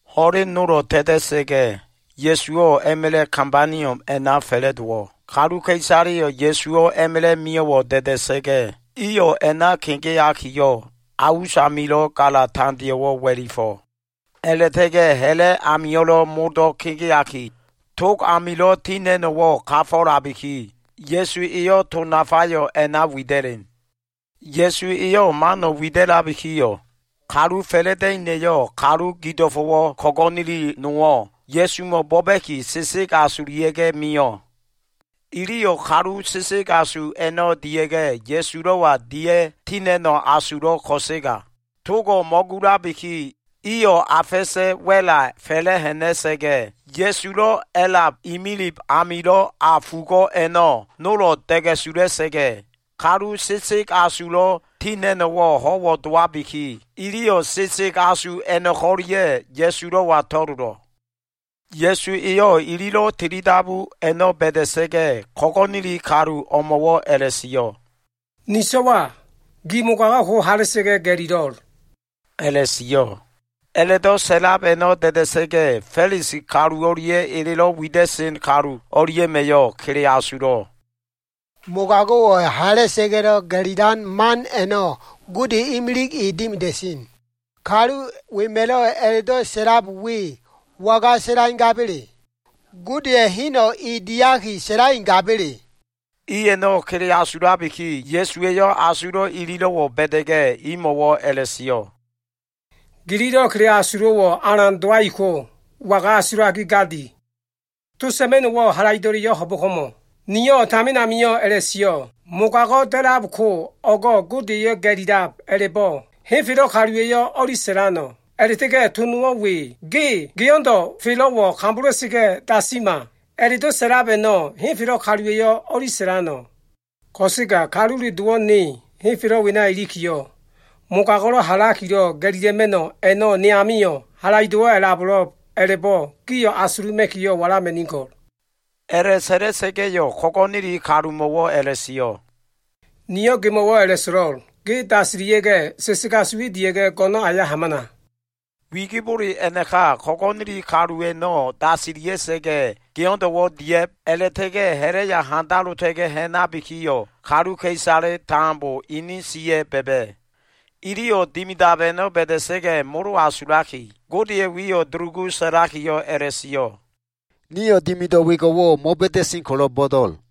Ho꞉len nolo꞉ ta꞉ta꞉sa꞉ga꞉, Ya꞉suwo꞉ a꞉ma꞉la꞉ Kabaniom a꞉na fa꞉la꞉dowo꞉. Kaluka꞉isaleyo꞉ Ya꞉suwo꞉ a꞉ma꞉la꞉ mio꞉wo꞉ da꞉da꞉sa꞉ga꞉, iyo꞉ a꞉na kegeakiyo꞉, a usamilo꞉ gala tandeo꞉wo꞉ wa꞉lifo꞉. A꞉la꞉ta꞉ga꞉ ha꞉la꞉ amio꞉lo꞉ modo꞉ kegeaki, tog amilo꞉ tina꞉no꞉wo꞉ kafo꞉labiki, Ya꞉su eyo꞉ to nafayo꞉ a꞉na wida꞉len. Ya꞉su eyo꞉ mano꞉ wida꞉labikiyo꞉, kalu fa꞉la꞉da꞉ina꞉yo꞉ kalu gido꞉fo꞉wo꞉ ko꞉go꞉neli nowo꞉ Ya꞉sumo꞉ bo꞉ba꞉ki sesegasulia꞉ mio꞉. Iliyo꞉ kalu sesegasu a꞉no꞉ dia꞉ga꞉, Ya꞉sulo꞉wa dia꞉ ti ha꞉na꞉no꞉ asulo꞉ ko꞉sega, togo꞉ mo꞉gulabiki, iyo꞉ a fa꞉sa꞉ wa꞉la fa꞉la꞉ ha꞉na꞉sa꞉ga꞉, Ya꞉sulo꞉ a꞉lab imilib amilo꞉ a fugo꞉ a꞉no꞉ nolo꞉ da꞉ga꞉sula꞉sa꞉ga꞉, kalu sesegasulo꞉ ti ha꞉na꞉no꞉wo꞉ ho꞉wo꞉ dowabiki, iliyo꞉ kalu sesegasu a꞉no꞉ko꞉lia꞉ Ya꞉sulo꞉wa to꞉lolo꞉. Ya꞉su eyo꞉ ililo꞉ tilidabu a꞉no꞉ ba꞉da꞉sa꞉ga꞉, ko꞉go꞉neli kalu o꞉mo꞉wo꞉ a꞉la꞉sio꞉, “Ni so꞉wa, gi mogago꞉ ko hala꞉sa꞉ga꞉ ga꞉lilo꞉,” a꞉la꞉sio꞉. A꞉la꞉do꞉ sa꞉lab a꞉no꞉ da꞉da꞉sa꞉ga꞉ Fa꞉lisi kalu o꞉lia꞉ elelo꞉ wida꞉sen kalu o꞉lia꞉ma꞉yo꞉ kele asulo꞉. “Mogago꞉wo꞉ hala꞉sa꞉ga꞉lo꞉ ga꞉lilan man a꞉no꞉ Gode imilig e dimida꞉sen. Kalu wema꞉lo꞉ a꞉la꞉do꞉ sa꞉lab we, waga sa꞉laigaba꞉le? Godeya꞉ heno꞉ e diaki sa꞉laigaba꞉le?” I a꞉no꞉ kele asulabiki, Ya꞉suwa꞉yo꞉ asulo꞉ ililo꞉wo꞉ ba꞉da꞉ga꞉, imo꞉wo꞉ a꞉la꞉sio꞉, “Gililo꞉ kele asulo꞉wo꞉ alan dowaiko, waga asulaki gadi? To sa꞉ma꞉no꞉wo꞉ halaido꞉leyo꞉ ho꞉bo꞉ko꞉mo꞉? Niyo꞉ tamin amio꞉ a꞉la꞉sio꞉, ‘Mogago꞉ da꞉labko o꞉go꞉ Godeya꞉ ga꞉lilab’ a꞉la꞉bo꞉, henfelo꞉ kaluwa꞉yo꞉ o꞉li sa꞉lano꞉? A꞉la꞉ta꞉ga꞉ to nowo꞉ we ‘Ge geo꞉ndo꞉ felo꞉wo꞉ kambola꞉sa꞉ga꞉ dasima!’ a꞉la꞉do꞉ sa꞉lab a꞉no꞉, henfelo꞉ kaluwa꞉yo꞉ o꞉li sa꞉lano꞉? Ko꞉sega Kalule Dowo꞉ ne henfelo꞉ wena ilikiyo꞉, mogago꞉lo꞉ halakilo꞉ ga꞉lila꞉ma꞉no꞉ a꞉no꞉ ne amio꞉ halaido꞉wo꞉ a꞉labo꞉lo꞉b a꞉la꞉bo꞉ gio꞉ asuluma꞉kiyo꞉ walama꞉nigo꞉l.” A꞉la꞉sa꞉la꞉sa꞉ga꞉yo꞉ ko꞉go꞉neli kalumo꞉wo꞉ a꞉la꞉sio꞉, “Niyo꞉ gemo꞉wo꞉ a꞉la꞉so꞉lo꞉l. Ge dasilia꞉ga꞉, sesegasu we dia꞉ga꞉, go꞉no꞉n aya hamana.” Wigibole a꞉naka ko꞉go꞉neli kalu a꞉no꞉ dasilia꞉sa꞉ga꞉, geo꞉ndo꞉wo꞉ dia꞉b a꞉la꞉ta꞉ga꞉ ha꞉la꞉ya handalota꞉ga꞉ ha꞉nabikiyo꞉, kaluka꞉isale tambo inin siya꞉ ba꞉ba꞉. Iliyo꞉ dimidab a꞉no꞉ ba꞉da꞉sa꞉ga꞉, molo asulaki, Godeya꞉ wiyo꞉ dulugu sa꞉lakiyo꞉ a꞉la꞉sio꞉, “Nio꞉ dimido꞉ wengo꞉wo꞉ mo꞉ba꞉da꞉sen ko꞉lo꞉ bo꞉do꞉l.”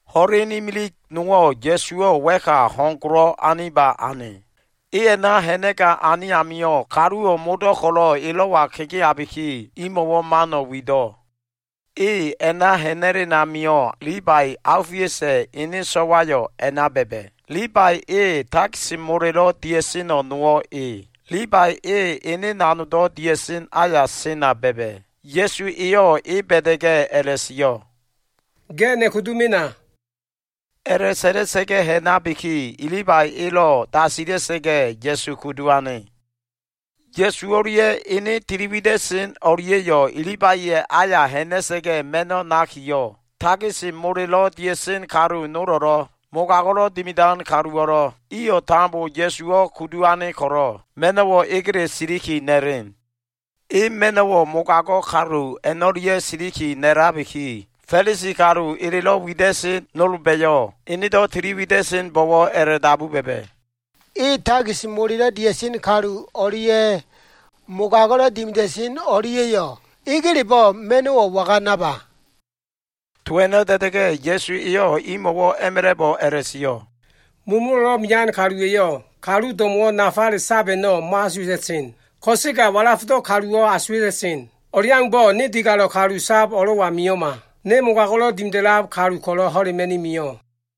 Ho꞉len imilig nowo꞉ Ya꞉suwo꞉ wa꞉ka ho꞉n golo꞉ aniba ane. E a꞉na ha꞉na꞉gane amio꞉, kaluwo꞉ modo꞉ ko꞉lo꞉ elo꞉wa kegeabiki, imo꞉wo꞉ mano꞉ wido꞉. E a꞉na ha꞉na꞉len amio꞉, Libai, Aofiusa꞉ ene so꞉wayo꞉ a꞉na ba꞉ba꞉. Libai e takis molelo꞉ dia꞉seno꞉ nowo꞉ e. Libai e ene nanogdo꞉ dia꞉sen aya sena ba꞉ba꞉. Ya꞉su eyo꞉ e ba꞉da꞉ga꞉ a꞉la꞉sio꞉, “Ge ne kudu mena.” A꞉la꞉sa꞉la꞉sa꞉ga꞉ ha꞉nabiki, Libai elo꞉ dasila꞉sa꞉ga꞉, Ya꞉su kudu ane. Ya꞉su o꞉lia꞉ ene tiliwida꞉sen o꞉lia꞉yo꞉, Libaiya꞉ aya ha꞉na꞉sa꞉ga꞉ ma꞉no꞉ nakiyo꞉, takis molelo꞉ dia꞉sen kalu nolo꞉lo꞉, mogago꞉lo꞉ dimidan kaluwo꞉lo꞉, iyo꞉ tambo Ya꞉suwo꞉ kudu ane ko꞉lo꞉ ma꞉no꞉wo꞉ egele siliki na꞉len. E ma꞉no꞉wo꞉ mogago꞉ kalu a꞉no꞉lia꞉ siliki na꞉labiki, Fa꞉lisi kalu elelo꞉ wida꞉sen nolba꞉yo꞉, enedo꞉ tiliwida꞉senbo꞉wo꞉ a꞉la꞉dabu ba꞉ba꞉, “E takis molelo꞉ dia꞉sen kalu o꞉lia꞉ mogago꞉lo꞉ dimida꞉sen o꞉lia꞉yo꞉ egelebo꞉ ma꞉no꞉wo꞉ waga naba?” To a꞉no꞉ da꞉da꞉ga꞉, Ya꞉su eyo꞉ imo꞉wo꞉ a꞉ma꞉la꞉bo꞉ a꞉la꞉sio꞉, “Mulumulo꞉lo꞉ mean kaluwa꞉yo꞉ kalu do꞉mo꞉wo꞉ nafale sab a꞉no꞉ mo꞉asuwa꞉ta꞉sen. Ko꞉sega walafdo꞉ kaluwo꞉ asuwa꞉ta꞉sen. O꞉leaumbo꞉, ne digalo꞉ kalu sab o꞉lo꞉wa mio꞉ma. Ne mogago꞉lo꞉ dimida꞉lab kalu ko꞉lo꞉ ho꞉lema꞉ni mio꞉.”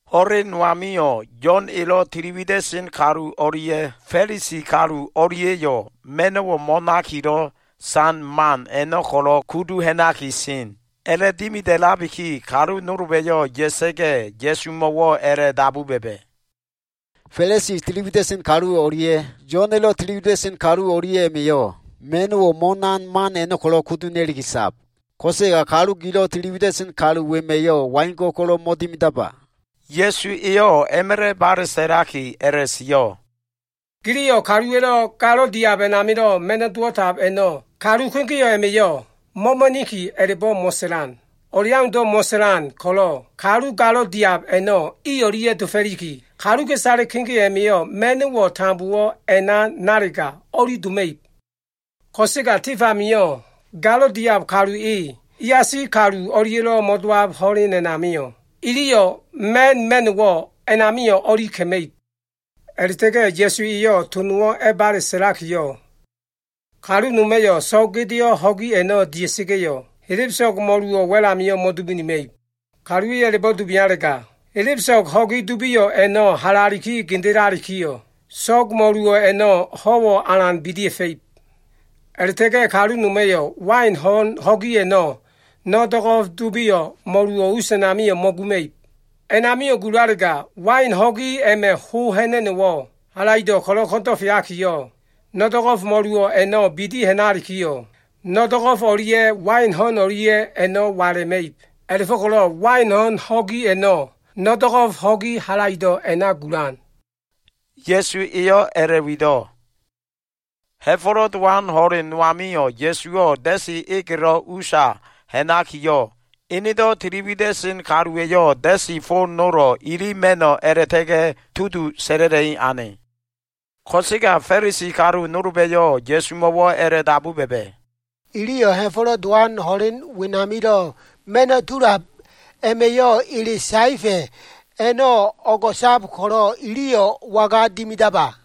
Ho꞉len no amio꞉, Yo꞉n elo꞉ tili wida꞉sen kalu o꞉lia꞉ Fa꞉lisi kalu o꞉lia꞉yo꞉ ma꞉no꞉ mo꞉nakilo꞉ san man a꞉no꞉ ko꞉lo꞉ kudu ha꞉naki sen. A꞉la꞉dimida꞉labiki, kalu nolba꞉yo꞉ ya꞉sa꞉ga꞉ Ya꞉sumo꞉wo꞉ a꞉la꞉dabu ba꞉ba꞉, “Fa꞉lisi tili wida꞉sen kalu o꞉lia꞉ Yo꞉n elo꞉ tili wida꞉sen kalu o꞉lia꞉ma꞉yo꞉ ma꞉no꞉ mo꞉nan man a꞉no꞉ ko꞉lo꞉ kudu ha꞉na꞉liki sab. Ko꞉sega gilo꞉ tili wida꞉sen kalu wema꞉yo꞉ waingo꞉ ko꞉lo꞉ mo꞉dimidaba?” Ya꞉su eyo꞉ a꞉ma꞉la꞉ bale sa꞉laki a꞉la꞉sio꞉, “Giliyo꞉ kaluwa꞉lo꞉ galo꞉ diab a꞉namilo꞉ ma꞉no꞉ dowo꞉tab a꞉no꞉ kalu kegeo꞉ a꞉ma꞉yo꞉ na꞉so꞉boka꞉ a꞉la꞉bo꞉ mo꞉sa꞉lan. O꞉leaundo꞉ mo꞉sa꞉lan ko꞉lo꞉, kalu galo꞉ diab a꞉no꞉ i o꞉lia꞉ dofo꞉liki, kaluka꞉isale kegeo꞉ a꞉ma꞉yo꞉ ma꞉no꞉wo꞉ tambowo꞉ a꞉na nalega, o꞉li doma꞉ib. Ko꞉sega tif amio꞉ galo꞉ diab kalu e, iasi kalu o꞉lia꞉lo꞉ mo꞉dowab ho꞉len a꞉namio꞉, iliyo꞉ ma꞉n ma꞉no꞉wo꞉ a꞉namio꞉ o꞉li ka꞉ma꞉ib.” A꞉la꞉ta꞉ga꞉ Ya꞉su eyo꞉ to nowo꞉ a꞉bale sa꞉lakiyo꞉, “Kalu noma꞉yo꞉ so꞉g gedeo꞉ ho꞉gi a꞉no꞉ dia꞉sa꞉ga꞉yo꞉, helebeso꞉g mo꞉luwo꞉ wa꞉l amio꞉ mo꞉dubinima꞉ib. Kaluwa꞉yo꞉ a꞉la꞉bo꞉ dubialega, helebeso꞉g ho꞉gi dubio꞉ a꞉no꞉ halaliki gendelalikiyo꞉, so꞉g mo꞉luwo꞉ a꞉no꞉ alan a꞉bidia꞉fa꞉ib. A꞉la꞉ta꞉ga꞉ kalu noma꞉yo꞉ wain ho꞉n ho꞉gi a꞉no꞉ no꞉ do꞉go꞉f dubio꞉ mo꞉luwo꞉ us a꞉namio꞉ mo꞉guma꞉ib. A꞉namio꞉ gulalega, wain ho꞉gi a꞉ma꞉ ho ha꞉na꞉no꞉wo꞉ halaido꞉ ko꞉lo꞉ ko꞉ndo꞉feakiyo꞉, no꞉ do꞉go꞉f mo꞉luwo꞉ a꞉no꞉ bidi ha꞉nalikiyo꞉, no꞉ do꞉go꞉f o꞉lia꞉ wain ho꞉n o꞉lia꞉ a꞉no꞉ wala꞉ma꞉ib. A꞉la꞉fo꞉ko꞉lo꞉ wain ho꞉n ho꞉gi a꞉no꞉ no꞉ do꞉go꞉f ho꞉gi halaido꞉ a꞉na gulan.” Ya꞉su eyo꞉ a꞉la꞉wido꞉. Ha꞉fo꞉lo꞉ Dowan ho꞉len no amio꞉, Ya꞉suwo꞉ da꞉si egelo꞉ usa ha꞉nakiyo꞉, enedo꞉ tili wida꞉sen kaluwa꞉yo꞉ da꞉si fo nolo꞉ ili ma꞉no꞉ a꞉la꞉ta꞉ga꞉ tudu sa꞉la꞉la꞉i ane. Ko꞉sega Fa꞉lisi kalu nolba꞉yo꞉ Ya꞉sumo꞉wo꞉ a꞉la꞉dabu ba꞉ba꞉, “Iliyo꞉ Ha꞉fo꞉lo꞉ Dowan ho꞉len wenamilo꞉ ma꞉no꞉ tulab a꞉ma꞉yo꞉ ele saefa꞉ a꞉no꞉ o꞉go꞉sab ko꞉lo꞉, iliyo꞉ waga dimidaba?”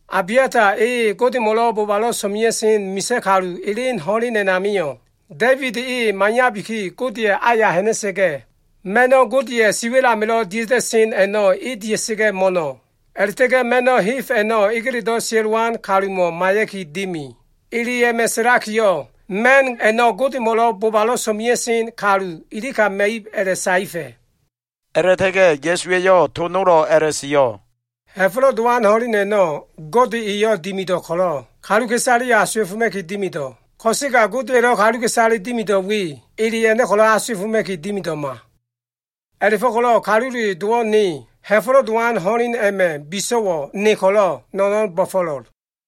Abiata e Godemo꞉ bobalo꞉ so꞉mea꞉sen misa꞉ kalu elen ho꞉len a꞉namio꞉, Da꞉ibid e maiyabiki, Godeya꞉ aya ha꞉na꞉sa꞉ga꞉, ma꞉no꞉ Godeya꞉ siwa꞉l amilo꞉ dia꞉ta꞉sen a꞉no꞉ e dia꞉sa꞉ga꞉ mo꞉no꞉. A꞉la꞉ta꞉ga꞉ ma꞉no꞉ heb a꞉no꞉ egeledo꞉ sia꞉lowan kalumo꞉ maiya꞉ki dimi. Ele a꞉ma꞉ sa꞉lakiyo꞉, ma꞉n a꞉no꞉ Godemo꞉ bobalo꞉ so꞉mea꞉sen kalu ilika ma꞉ib, a꞉la꞉saefa꞉.” A꞉la꞉ta꞉ga꞉ Ya꞉su eyo꞉ to nolo꞉ a꞉la꞉sio꞉, “Ha꞉fo꞉lo꞉ Dowan ho꞉len a꞉no꞉ Gode eyo꞉ dimido꞉ ko꞉lo꞉, kaluka꞉isaleyo꞉ asuwa꞉foma꞉ki dimido꞉. Ko꞉sega Godeya꞉lo꞉ kaluka꞉isale dimido꞉ we, ele a꞉no꞉ ko꞉lo꞉ asuwa꞉foma꞉ki dimido꞉ma. A꞉la꞉fo꞉ko꞉lo꞉ Kalule Dowo꞉ ne, Ha꞉fo꞉lo꞉ Dowan ho꞉len a꞉ma꞉ biso꞉wo꞉ ne ko꞉lo꞉, no꞉no꞉n bo꞉fo꞉lo꞉l.”